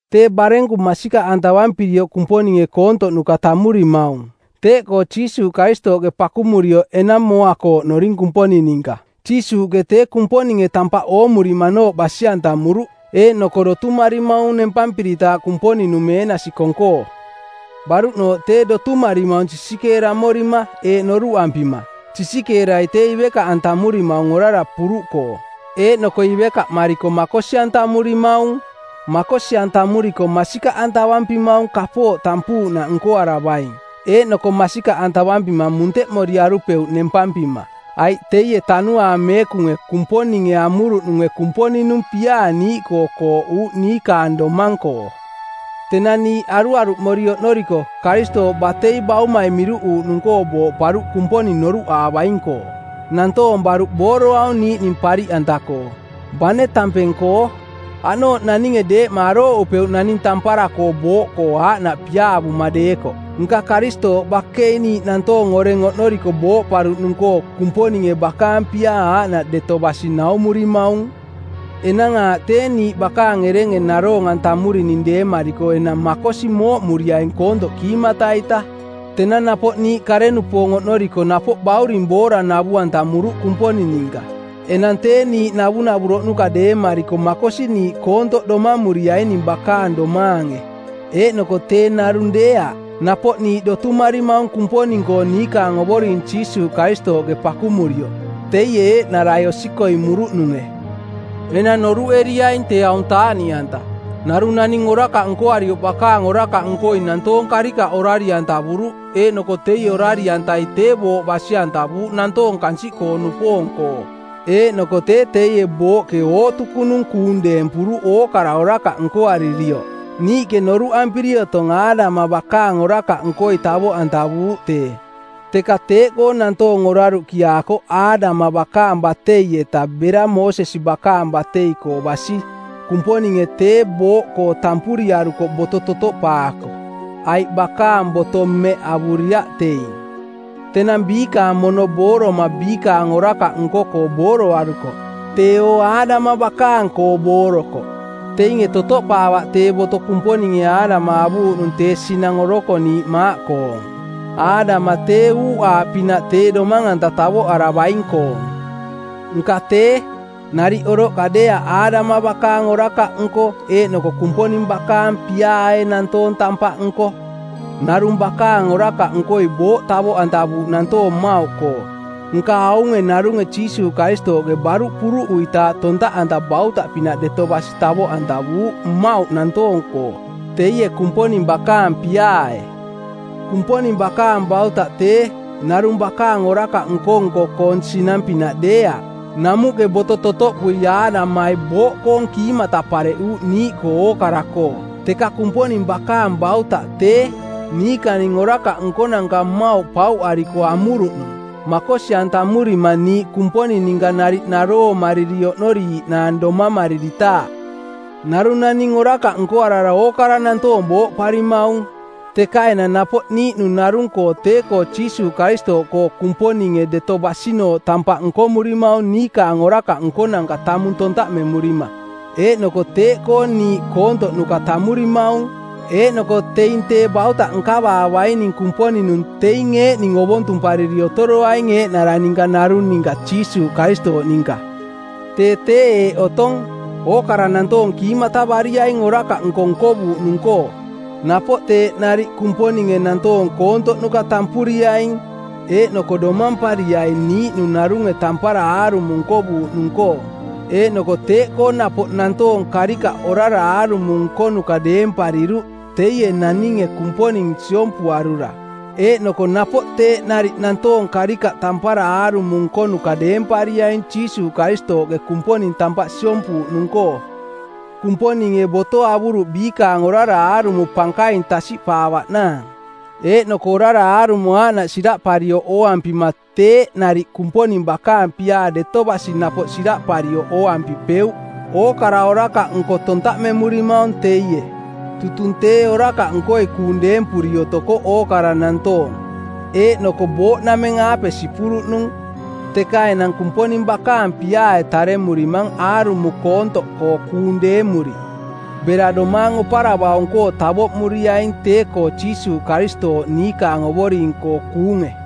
Tee barenku masikaꞌantavampirioꞌ Kumponinge koontoꞌnuka tammurimaung. Teeꞌkoo Jiisuuꞌ Karistooꞌke pakumurioꞌ enang mooa-koo oꞌnoring Kumponing ninka. Jiisuuꞌke tee Kumponinge tampaꞌ oomurimanooꞌ basi-antamuruꞌ eeꞌnoko dotumarimaung nempampiritaaꞌ Kumponing-nung meenasi kong-koo. Baruꞌnooꞌ tee dotumarimaung sisikeeramorima eeꞌ noruꞌampima: Sisikeerai tee ivekaꞌantamurimaung orara puruꞌkoo. Eeꞌnoko ivekaꞌmariko makosi-antamurimaung. Makosi-antamuriko masikaꞌantavampimaung kapooꞌ tampuuꞌnaꞌ nkoaravaing. Eeꞌnoko masikaꞌantavampima munteꞌmoriarupeuꞌ nempampima, aiꞌ teie Tanuaang Meekunge, Kumponinge amuruꞌnunge Kumponing-nung piaa niiꞌkoo kooꞌuuꞌ niikaang domang-koo. Tenang niiꞌ aruaruꞌmori oꞌnoriko, Karistooꞌ batei baumai miruꞌuuꞌnung-koo booꞌparuꞌ Kumponing noruꞌaavaing-koo. Nantoong baruꞌ booroaung niiꞌning pariꞌanta-koo, bane tampeng-koo. Aꞌnooꞌ naninge deeꞌma arooꞌupeuꞌ naning tampara-koo booꞌkoo aaꞌnaꞌ piaavoma deekoꞌ. Nka Karistooꞌ bakei niiꞌ nantoong oreng oꞌnoriko booꞌparuꞌnung-koo Kumponinge bakaang piaa aaꞌnaꞌ deto basi naumurimaung. Enang aaꞌ tee niiꞌ bakaang erenge naroong-antamurining deemariko enang makosi mooꞌmuriaing koontoꞌ kiimata-ita. Tenang napoꞌ niiꞌ kare-nupoong oꞌnoriko napoꞌ bauring boora navu-antamuruꞌ Kumponing ninka. Enang tee niiꞌ navunavuroꞌnuka deemariko makosi niiꞌ koontoꞌ domamuriaining bakaang domaange. Eeꞌnoko tee narung deeaꞌ. Napoꞌ niiꞌ dotumarimaung Kumponing-koo niikaang Ovoring Jiisuuꞌ Karistooꞌke pakumurioꞌ, teie eeꞌnarai osikoimuruꞌnunge. Enang noruꞌeriaing tee aung taaꞌniꞌanta. Narung naning orakaꞌ nkoarioꞌ bakaang orakaꞌnkoi nantoong karikaꞌ orari-antavuruꞌ eeꞌnoko teie orari-antai tee booꞌ basi-antavuuꞌ nantoong kansiꞌkoo-nupoong-koo. Eeꞌnoko tee teie booꞌke ootukunung kuung deempuruꞌ ookara orakaꞌ nkoaririoꞌ. Niiꞌke noruꞌampiri otong Aadama bakaang orakaꞌnkoi tavoꞌantavuuꞌ tee. Teka teeꞌkoo nantoong oraruꞌkiaakoꞌ Aadama bakaang batei-eta bera Moosesi bakaang batei-koo basi. Kumponinge tee booꞌkoo tampuriarukoꞌ boto totoꞌpaako, aiꞌ bakaang boto mmeꞌ avuriaꞌ teing. Tenang biikaang mono booroma biikaang orakaꞌ nko-koo booroarukoꞌ, teeo Aadama bakaang-koo boorokoꞌ. Teinge totoꞌpaavaꞌ tee boto Kumponinge Aadama avuuꞌnung tee sinang orokoniiꞌ maaꞌkoong. Aadama tee uuꞌaaꞌpinaꞌ tee Domang-anta Tavoꞌaravaing-koong. Nka tee, nariꞌ oroꞌka deeaꞌ Aadama bakaang orakaꞌnko eeꞌnoko Kumponing bakaang piaae nantoong tampaꞌnko. Narung bakaang orakaꞌnkoi booꞌ tavoꞌantavuuꞌ nantoong mmauꞌkoo, nka aunge narunge Jiisuuꞌ Karistooꞌke baruꞌ puruꞌuitaaꞌ tontaꞌanta bautaꞌpinaꞌ deto basi tavoꞌantavuuꞌ mmauꞌ nantoong-koo teie Kumponing bakaang piaae. Kumponing bakaang bautaꞌ tee, narung bakaang orakaꞌ nko-nko-koong sinang-pinaꞌ deeaꞌ. Namuꞌke boto totoꞌpui Aadamai booꞌkoong kiimata pareꞌuuꞌ niiꞌkoo ookara-koo. Teka Kumponing bakaang bautaꞌ tee, niikaning orakaꞌ nkonanka mmauꞌ pauꞌariko amuruꞌnung, makosi-antamurima niiꞌ Kumponing ninka nariꞌ naroomariri oꞌnoriiiꞌnaang domamariritaaꞌ. Narung naning orakaꞌ nkoarara ookara nantoong booꞌparimaung. Teka enang napoꞌ niiꞌnung narung-koo tee-koo Jiisuuꞌ Karistooꞌkoo Kumponinge deto basinooꞌ tampaꞌ nkomurimaung niikaang orakaꞌ nkonanka tamung tontaꞌmemurima. Eeꞌnoko teeꞌkoo niiꞌ koontoꞌnuka tammurimaung. Eeꞌnoko teing tee bautaꞌ nkavaavaining Kumponing-nung teing eeꞌning ovontumpariri otoroaing eeꞌnara ninka narung ninka Jiisuuꞌ Karistooꞌ ninka. Tee tee eeꞌ otong: Ookara nantoong kiimatavariaing orakaꞌnko nkovuuꞌnung-koo, napoꞌ teeꞌ nariꞌ Kumponinge nantoong koontoꞌnuka tampuriaing eeꞌnoko domampariai niiꞌnung narunge tampara aarumo nkovuuꞌnung-koo. Eeꞌnoko teeꞌkoo napoꞌ nantoong karikaꞌ orara aarumo nkonuka deempariruꞌ teie naninge Kumponing siompuarura, eeꞌnoko napoꞌ teeꞌ nariꞌ nantoong karikaꞌ tampara aarumo nkonuka deempariaing Jiisuuꞌ Karistooꞌke Kumponing tampaꞌ siompuuꞌnung-koo. Kumponinge boto avuruꞌ biikaang orara aarumo pankaing tasiꞌpaavaꞌnaang. Eeꞌnoko orara aarumo aaꞌnaꞌ siraꞌparioꞌ ooampima teeꞌ nariꞌ Kumponing bakaang piaa deto basi napoꞌ siraꞌparioꞌ ooampipeuꞌ. Ookara orakaꞌnko tontaꞌmemurimaung teie. Tutung tee orakaꞌnkoi kuung deempuri otokoꞌ ookara nantoong, eeꞌnoko booꞌnameng-aape sipuruꞌnung, teka enang Kumponing bakaang piaae taremurimang aarumo koontoꞌkoo kuung deemuri, bera domaang oparavaung-koo tavoꞌmuriaing tee-koo Jiisuuꞌ Karistooꞌ niikaang Ovoring-koo kuunge.